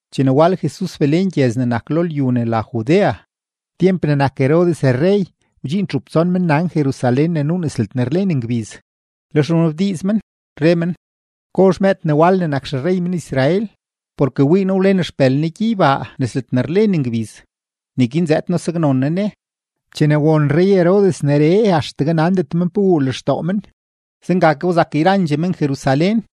Chene wal Jesus Belén gyëz ne nak lo lyu ne la Judea, tyemp ne nak Herodes rrey, wdxiin txup tson mennan Jerusalén ne nuu nes ledne rlen ngbiz. Lex wnabdiiz men, re men: ―¿Gozh mëëd ne wal ne nak xerrey men-Israel? Porke wii noo wlen xpël ne gyeybaa nes ledne rlen ngbiz, neguin zëëd noo saknzoon noo ne. Chene won rrey-Herodes neree, axtegue nandet men pe wuu lextoo men. Zenga ke wzak yrandxee men-Jerusalén.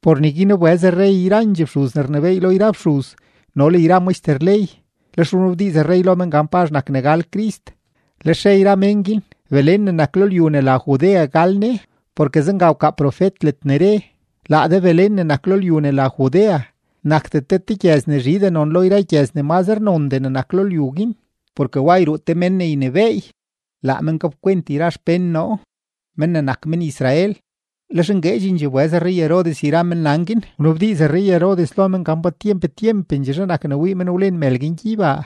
Por neguin wbëz rrey yrandxee fxuz ne rnebééy lo yra fxuz no le yra maxter ley, lex wnabdiiz rrey lo men gan pazh nak ne gal Crist. Lex re yra mén guin: ―Belén ne nak lo lyu ne la Judea gal Ne, porke zenga wkaa profet ledne re: Laa de Belén ne nak lo lyu ne la Judea, nakdet de te gyëz ne zhindxee non lo yra gyëz ne mazre nondee ne nak lo lyu guin. Porke wa yruu te mén ne ynebééy, laa men gapkwent yra xpén noo, men ne nak men-Israel. Lex ngueedxendxee wbëz rrey-Herodes yra mennan guin wnabdiiz rrey-Herodes lo men gan pa tyemp tyempendxeezhe nak ne wii men wlen mël guin gyeybaa.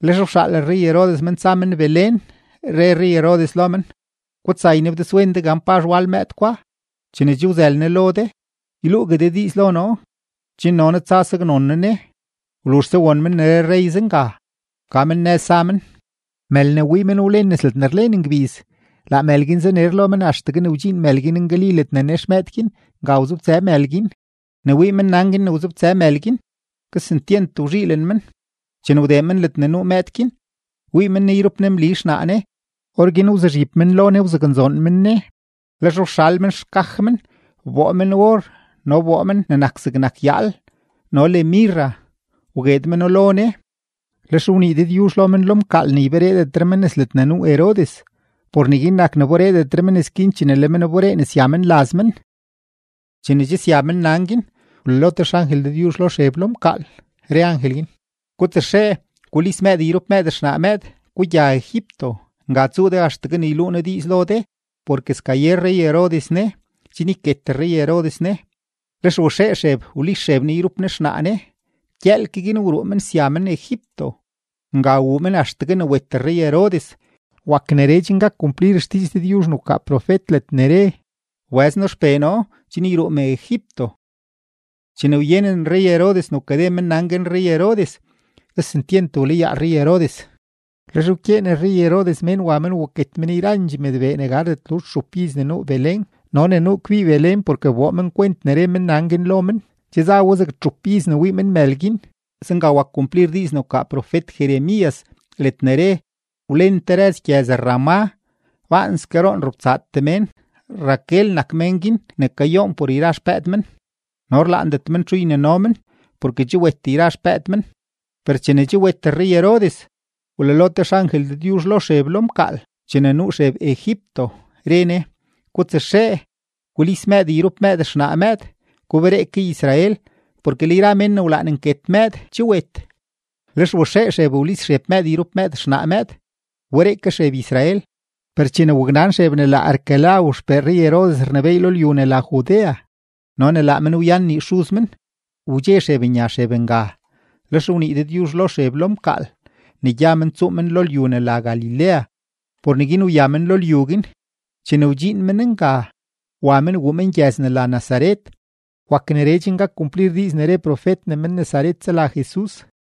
Lex wxaal rrey-Herodes men ne tsa men Belén, re rrey-Herodes lo men: ―Gutsa, ynabdizwen de gan pazh wal mëëd gwa; chene che wzël ne lo de, yluugue de diiz lo noo, chen no noo tsa saknzoon noo ne. Wluzhse won men ne re rrey zenga, wka men nëz za men. Mël ne wii men wlen nes ledne rlen ngbiz, laa mël guin zaner lo men axtegue ne wdxiin mël guin ngali ledne nex mëëd guin, nga wzobtsë mël guin. Ne wii mennan guin ne wzobtsë mël guin, kesentyent wzhiilen men. Chene wdee men ledne nuu mëëd guin, wii men ne yrup ne Mli xnaa ne; orguin wzuzhib men lo ne wzaknzoon men ne. Lex wxal men xkaj men wboo men or no wboo men ne nak zegnak yaal no le mirra wgueed meno lo ne. Lex wnii Dëdyuzh lo men lo mkaal ne ybereedetre men nes ledne nuu Herodes. Por neguin nak ne wateedetre men nëz guin chene le men wberee ne sya men laz men. Chene che sya mennan guin, wlalo te xangel Dëdyuzh lo Xeb lo mkaal, re angel guin: ―Gutsaxee, gulis mëëd yrup mëëd xnaa mëëd, gugya Egipto. Nga tsuu de axtegue ne yluu noo diiz lo de, porke skaye rrey-Herodes ne, chen yket rrey-Herodes ne. Lex waxee Xeb wlis Xeb ne yrup ne xnaa ne, gyëël ke guin wruu men sya men Egipto. Nga wuu men axtegue ne wet rrey-Herodes. Wak neree chen gak kumplir xdiiz Dëdyuzh ne wkaa profet ledne re: “Wbëz noo XPee noo chen yruu me Egipto.” Chene wyenen rrey-Herodes ne wkade mennan guin rrey-Herodes, kesentyent wlayaa rrey-Herodes. Lex wkyeen rrey-Herodes mén wa men waket men yrandxee mëdbee ne gardet luzh txup iz ne nuu Belén no ne nuu kbii Belén porke wboo men kwent ne re mennan guin lo men, che za we zeg txup iz ne wii men mël guin. Zenga wak kumplir diiz ne wkaa profet-Jeremías ledne re: Wlen te rëz gyëz-Ramá, baanske roon robtsaatee mén. Raquel nak mén guin ne kayoon por yra xpëëd men, no rlaandet men txu ynino men porke che wet yra xpëëd men. Per chene che wet rrey-Herodes, wlalo te xangel Dëdyuzh lo Xeb lo mkaal chene nuu Xeb Egipto, re ne: ―Gutsaxee, gulis mëëd yrup mëëd xnaa mëëd, guberee ke Israel, porke le yra mén ne wlaan nket mëëd che wet. Lex waxee Xeb wlis Xeb mëëd yrup mëëd xnaa mëëd, wberee ke Xeb Israel. Per chene waknan Xeb ne laa Arquelao xpee rrey-Herodes rnebééy lo lyu ne la Judea no ne laa men wyan nii xuz men, wdxe Xeb nya men nga; lex wnii Dëdyuzh lo Xeb lo mkaal ne gya men tsuu men lo lyu ne la Galilea, por neguin wya men lo lyu guin. Chene wdxiin men nga, wa men wuu men gyëz ne la Nazaret. Wak neree chen gak kumplir diiz ne re profet ne men-Nazaret sela Jesus.